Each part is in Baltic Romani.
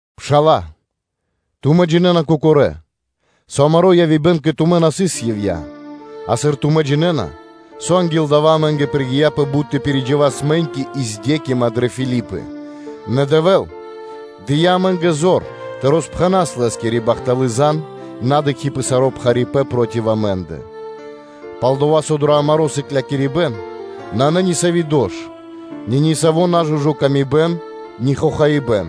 Пшала́лэ, тумэ́ джинэ́на, кокорэ́, со амаро́ явибэн кэ тумэ́ на сыс ивья́ (напра́снэс), а сыр тумэ́ джинэ́на, со анги́л дава́ амэ́нгэ пригияпэ бут тэ пиридживас мэ́ньки и ладжаипэ́н дрэ Филипы, нэ Дэвэ́л дыя́ амэ́нгэ зор тэ роспхэнас Лэ́скири бахталы́ зан, на дыкхи́ пэ саро́ пхарипэ́н проти амэ́ндэ. Пал-дова́ со дро амаро́ сыклякирибэ́н нанэ нисави́ дош, ни нисави́ нажужы мысля, ни хохаибэ́н,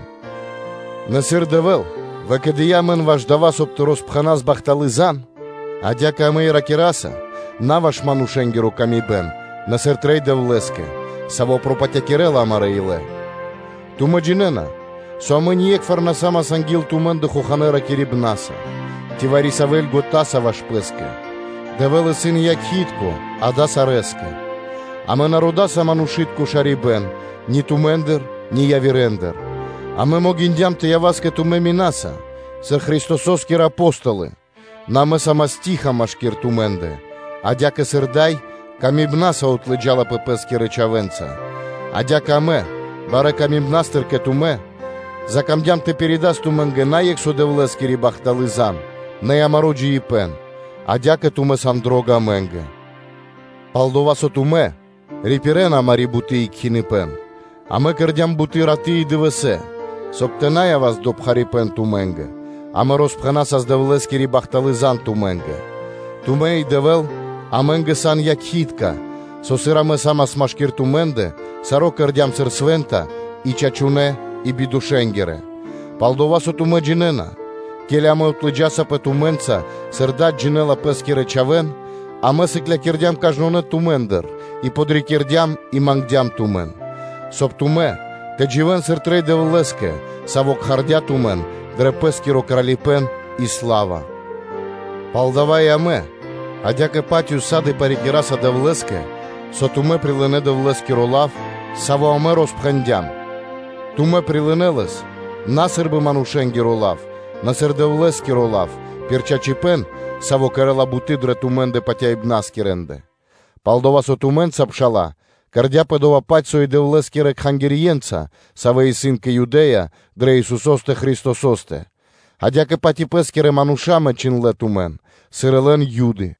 нэ, сыр Дэвэ́л выкэдыя́ амэн ваш дава́, соб (кай) тэ роспхэнас бахталы́ зан (звесь), адя́кэ амэ и ракираса на ваш манушэ́нгиро ило́, нэ сыр трэй Дэвлэ́скэ, Саво́ пропатякирэла амарэ́ илэ. Тумэ́ джинэ́на, со амэ ние́кхвар на са́мас анги́л тумэ́ндэ хоханэ́ ракирибнаса, ци вари-савэ́ бокхаса кэ ловэ́ ваш пэ́скэ: Дэвэ́л исын якхи́тко (свидетелё) далэ́ сарэскэ. Амэ на родаса манушы́тко шарибэ́н, ни тумэ́ндыр, ни явирэндыр, амэ могиндям тэ явас кэ тумэ́ минаса сыр Христосо́скирэ Апо́столы, нэ амэ са́мас штыл (тиха) машки́р тумэ́ндэ, адя́кэ сыр дай ласкаса отлыджалапэ пэ́скирэ чхавэ́нца, адя́кэ амэ, барэ́ тырдыпнастыр кэ тумэ́, закамдям тэ пиридас тумэ́нгэ на екх со Дэвлэ́скири бахталы́ зан (звесь), нэ и амаро́ джиибэ́н, адя́кэ тумэ́ сан дро́га амэ́нгэ. Пал-дова́ со тумэ́ рипирэна амари́ буты́ и кхиныпэн: амэ кэрдя́м буты́ раты́ и дывэсэ́, соб (кай) тэ на явас дро пхарипэ́н тумэ́нгэ, амэ роспхэнасас Дэвлэ́скири бахталы́ зан тумэ́нгэ. Тумэ́ и Дэвэ́л сан якхи́тка амэ́нгэ, со сыр амэ са́мас машки́р тумэ́ндэ, саро́ кэрдя́м сыр свэ́нта и чачунэ́ и бидошэнгирэ. Пал-дова́ со тумэ́ джинэ́на, ке́ли амэ отлыджасаспэ тумэ́нца, сыр дад джинэ́ла пэ́скирэ чхавэ́н: амэ сыклякирдям кажнонэ́ тумэ́ндыр и подрикирдям и мангдям тумэн; соб (кай) тумэ́ тэ дживэ́н, сыр трэй Дэвлэ́скэ, Саво́ кхардя́ тумэн дрэ Лэ́скиро Кралипэ́н и сла́ва. Палдава́ и амэ адя́кэ-паць ўса́ды (сак) парикираса Дэвлэ́скэ, со тумэ́ прилынэ́ Дэвлэ́скиро лав, саво́ амэ роспэндям, тумэ́ прилынэ́ лэс на сы́рбы манушэ́нгиро лав, нэ сыр Дэвлэ́скиро лав, пир чачипэ́н, саво́ кэрэ́ла буты́ дрэ тумэ́ндэ патяибнаскирэндэ. Палдава́ со тумэ́нца, пшала́лэ, кэрдя́пэ дова́-паць, со и Дэвлэ́скирэ кхангирьенца, савэ́ исын кэ Юдэ́я дрэ Исусо́стэ Христосо́стэ, адя́кэ-паць и пэ́скирэ мануша́ мэнчындлэ тумэн, сыр и лэн Юды,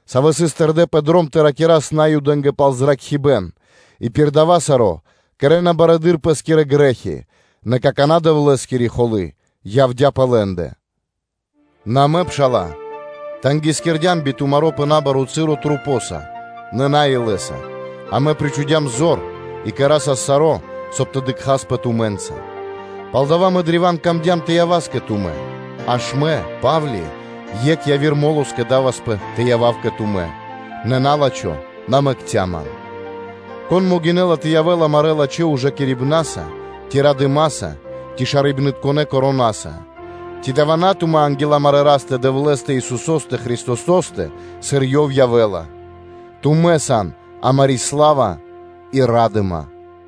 савэ́ сыс тэрдэ́ пэ дром тэ ракирас Наюдэ́нгэ пал зракхибэ́н, и пир дава́ саро́ кэрэ́на барэды́р пэ́скирэ грэ́хи: нэ какана́ Дэвлэ́скири холы́ явдя́ пэ лэ́ндэ. Нэ амэ, пшала́лэ, сыр розяцямпэ тумэ́нца пэ набаро́ часо (цы́ро) мо́са, нэ на илэ́са, амэ причхудям зор, и кэрасас саро́, соб (кай) тэ дыкхаспэ тумэ́нца; палдава́ мэ древа́н камдём тэ явас кэ тумэ́, аж мэ, Па́вли, екх яви́р мо́ло скэдаваспэ тэ явав кэ тумэ́, нэ на́лачхо на мэкця́ амэн. Кон могинэ́ла тэ явэ́л амарэ́ лачхэ́ ужакирибнаса, ци радыма́са, ци шарибнытконэ вянкаса (коронаса)? Ци дава́ исын на тумэ́ анги́л амарэ́ Растэ – Дэвлэ́стэ, Исусо́стэ Христосо́стэ, сыр Ёв явэ́ла. Тумэ́ сан амари́ сла́ва и ра́дыма.